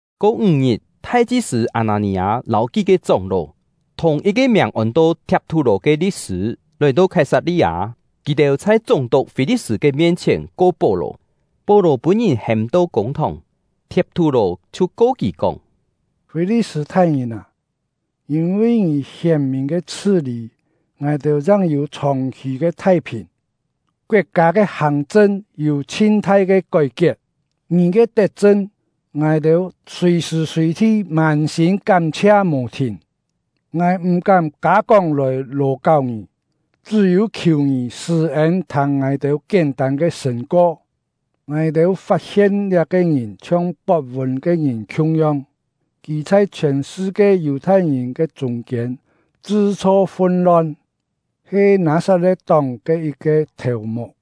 Ko ńg-ngit, thai-chi-sṳ̂ Â-nâ-nì-â lâu kí-ke chóng-ló, thùng yit-ke miàng ôn-to Thiap-thú-lò ke li̍t-sṳ̂, lòi-to Khái-sat-li-â. Kì-têu chhai chúng-tuk Fî-li̍t-sṳ̂ ke mien-chhièn ko Pó-lò. Pó-lò pûn-ngìn hêm-to kûng-thòng; Thiap-thú-lò chhiu ko kì kóng: “Fî-li̍t-sṳ̂ thai-ngìn â! Yîn-vi ngì hièn-mìn ke chhṳ-lî, ngài-têu chang yû chhòng-khì ke thai-phìn, koet-kâ ke hàng-chṳn yû chhin-thai ke kói-kiet. Ngì ke tet-chṳn, ngài-têu sùi-sṳ̀ sùi-thi mân-sîm kám-chhia mò thìn. Ngài m̀-kám kâ-kóng lòi lò-káu ngì, chṳ́-yû khiù ngì sṳ̂-ên thâng ngài-têu kién-tân ke sṳ̂n-ko: Ngài-têu fat-hien liá-ke ngìn chhiong pot-vûn ke ngìn khiung-yong. Kì chhai chhiòn sṳ-kie Yù-thai-ngìn ke chûng-kiên chṳ-chho fun-lon, he Nâ-sat-le̍t-tóng ke yit-ke thèu-muk,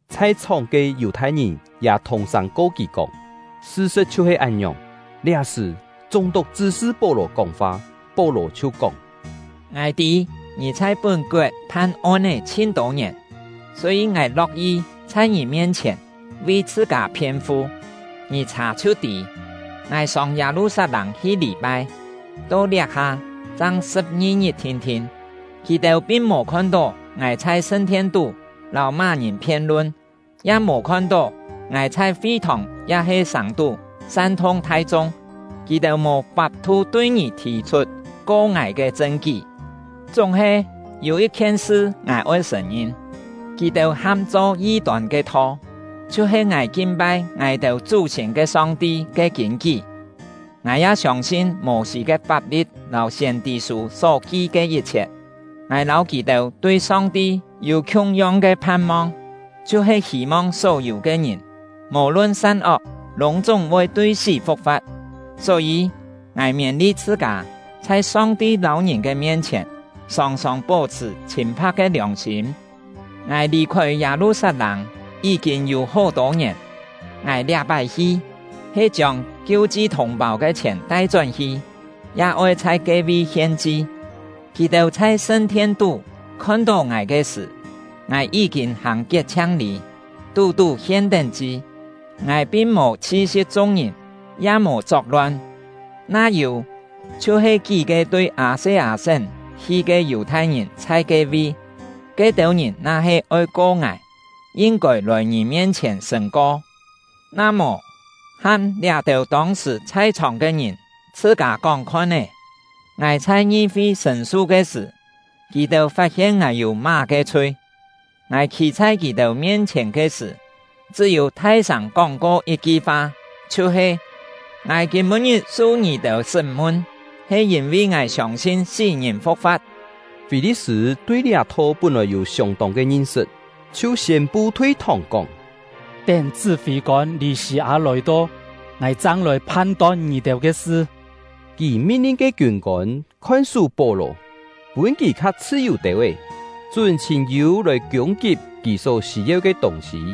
Chhai-chhòng ke Yù-thai-ngìn ya thùng-sâng ko kì kóng, sṳ-sṳ̍t chhiu-he án-ngiòng. Liá-sṳ̀, chúng-tuk chṳ́-sṳ Pó-lò kóng-fa. Pó-lò chhiu kóng: “Ngài tî ngì chhai pún-koet phan on-é chhin-tô ngièn, só-yî ngài lo̍k-yi chhai ngì mien-chhièn vi chhṳ-kâ phien-fu. Ngì chhà chhiu tî, ngài sông Yâ-lu-sat-lâng hi lî-pai, to liá-ha chang sṳ̍p-ngi-ngit thin-thin. Kì-têu pin mò khon-tó ngài chhai sṳn-thien-tú lâu má-ngìn phien-lun, ya mò khon-tó ngài chhai fi-thòng ya-he sàng-tú san-thung thai-chung. Kì-têu mò fap-thu tui ngì thì-chhut ko ngài ke chṳn-kí. Chúng-he, yû yit-khien sṳ ngài oi sṳ̀n-ngin: Kì-têu ham-cho yi-tôn ke Tho, chhiu-he ngài kin-pai ngài-têu chú-siên ke Song-ti ke kîn-kí. Ngài ya siông-sin Mô-sî ke fap-li̍t lâu siên-tî-sû só ki ke yit-chhiet. Ngài lâu kì-têu tui Song-ti yû khiung-yong ke phan-mong, chhiu-he hî-mong só-yû ke ngìn, mò-lun san-ok, lûng-chúng voi tui sí fu̍k-fa̍t. Só-yî, ngài miên-li chhṳ-kâ, chhai Song-ti lâu ngìn ke mien-chhièn, sòng-sòng pó-chhṳ̀ chhîn-pha̍k ke liòng-sîm. “Ngài lì-khôi Yâ-lu-sat-lâng yí-kîn yû hó-tô ngièn. Ngài liá-pái hi, he chiông kiu-chi thùng-pâu ke chhièn tai-chón-hi, ya oi chhai ke-vi hien-chi. Kì-têu chhai sṳn-thien-tú khon-tó ngài ke sṳ̀, ngài yí-kîn hàng kiet-chhiang-lî, tú-tú hien-tén chi; ngài pin mò chhi-si̍p chung-ngìn, ya mò chok-lon. Na yû, chhiu-he kí-ke tui Â-se-â-sén hi ke Yù-thai-ngìn chhai ke-vi; ke-têu ngìn na-he oi ko ngài, yin-kôi lòi ngì mien-chhièn sṳ̂n-ko. Na mò, ham liá-têu tông-sṳ̀ chhai-chhòng ke ngìn chhṳ-kâ kóng-khon-é, ngài chhai ngi-fi sṳ̂n-su ke sṳ̀, kì-têu fat-hien ngài yû má-ke chhui. Ngài khî chhai kì-têu mien-chhièn ke sṳ̀, chṳ́-yû thai-sâng kóng-ko yit-ki fa, chhiu-he: ‘Ngài kîm-pû-ngit su ngì-têu sṳ́m-mun, he yîn-vi ngài siông-sin sí-ngìn fu̍k-fa̍t.’” Fî-li̍t-sṳ̂ tui liá Tho pún-lòi yû siông-tông ke ngin-sṳt, chhiu siên-pu thui-thòng kóng: “Tén chṳ́-fî-kôn Lî-sî-â lòi-to, ngài chang lòi phan-ton ngì-têu ke sṳ.” Kì min-lin ke kiûn-kôn khon-sú Pó-lò, pûn kì kha chhṳ-yù têu-é, chún chhîn-yû lòi kiûng-kip kì só sî-yeu ke tûng-sî.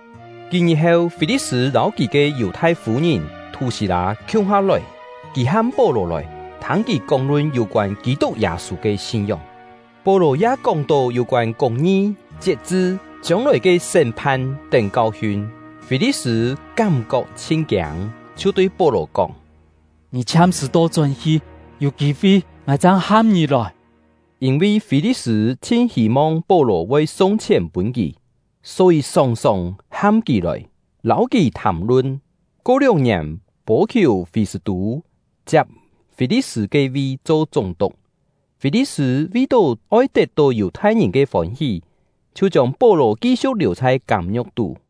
Kí-ngit heu, Fî-li̍t-sṳ̂ lâu kì ke Yù-thai fû-ngìn Thú-sî-lâ khiung-ha lòi. Kì ham Pó-lò lòi, thâng kì kóng-lun yû-koân Kî-tuk Yâ-sû ke sin-ngióng. Pó-lò ya kóng-to yû-koân kûng-ngi, chiet-chṳ, chiông-lòi ke sṳ́m-phan tén kau-hiun; Fî-li̍t-sṳ̂ kám-kok chhin kiâng, chhiu tui Pó-lò kóng: “Ngì chhiam-sṳ̀ to-chón hi, yû kî-fi ngài chang ham ngì lòi.” Yîn-vi Fî-li̍t-sṳ̂ chhin hî-mong Pó-lò voi sung chhièn pûn kì, só-yî sòng-sòng ham kì lòi, lâu kì thàm-lun. Ko lióng-ngièn, Pô-khiù-Fî-sṳ̂-tû chiap Fî-li̍t-sṳ̂ ke vi cho chúng-tuk. Fî-li̍t-sṳ̂ vi-tó oi tet-tó Yù-thai-ngìn ke fôn-hí, chhiu chiông Pó-lò ki-siu̍k liù chhai kâm-ngiu̍k tú.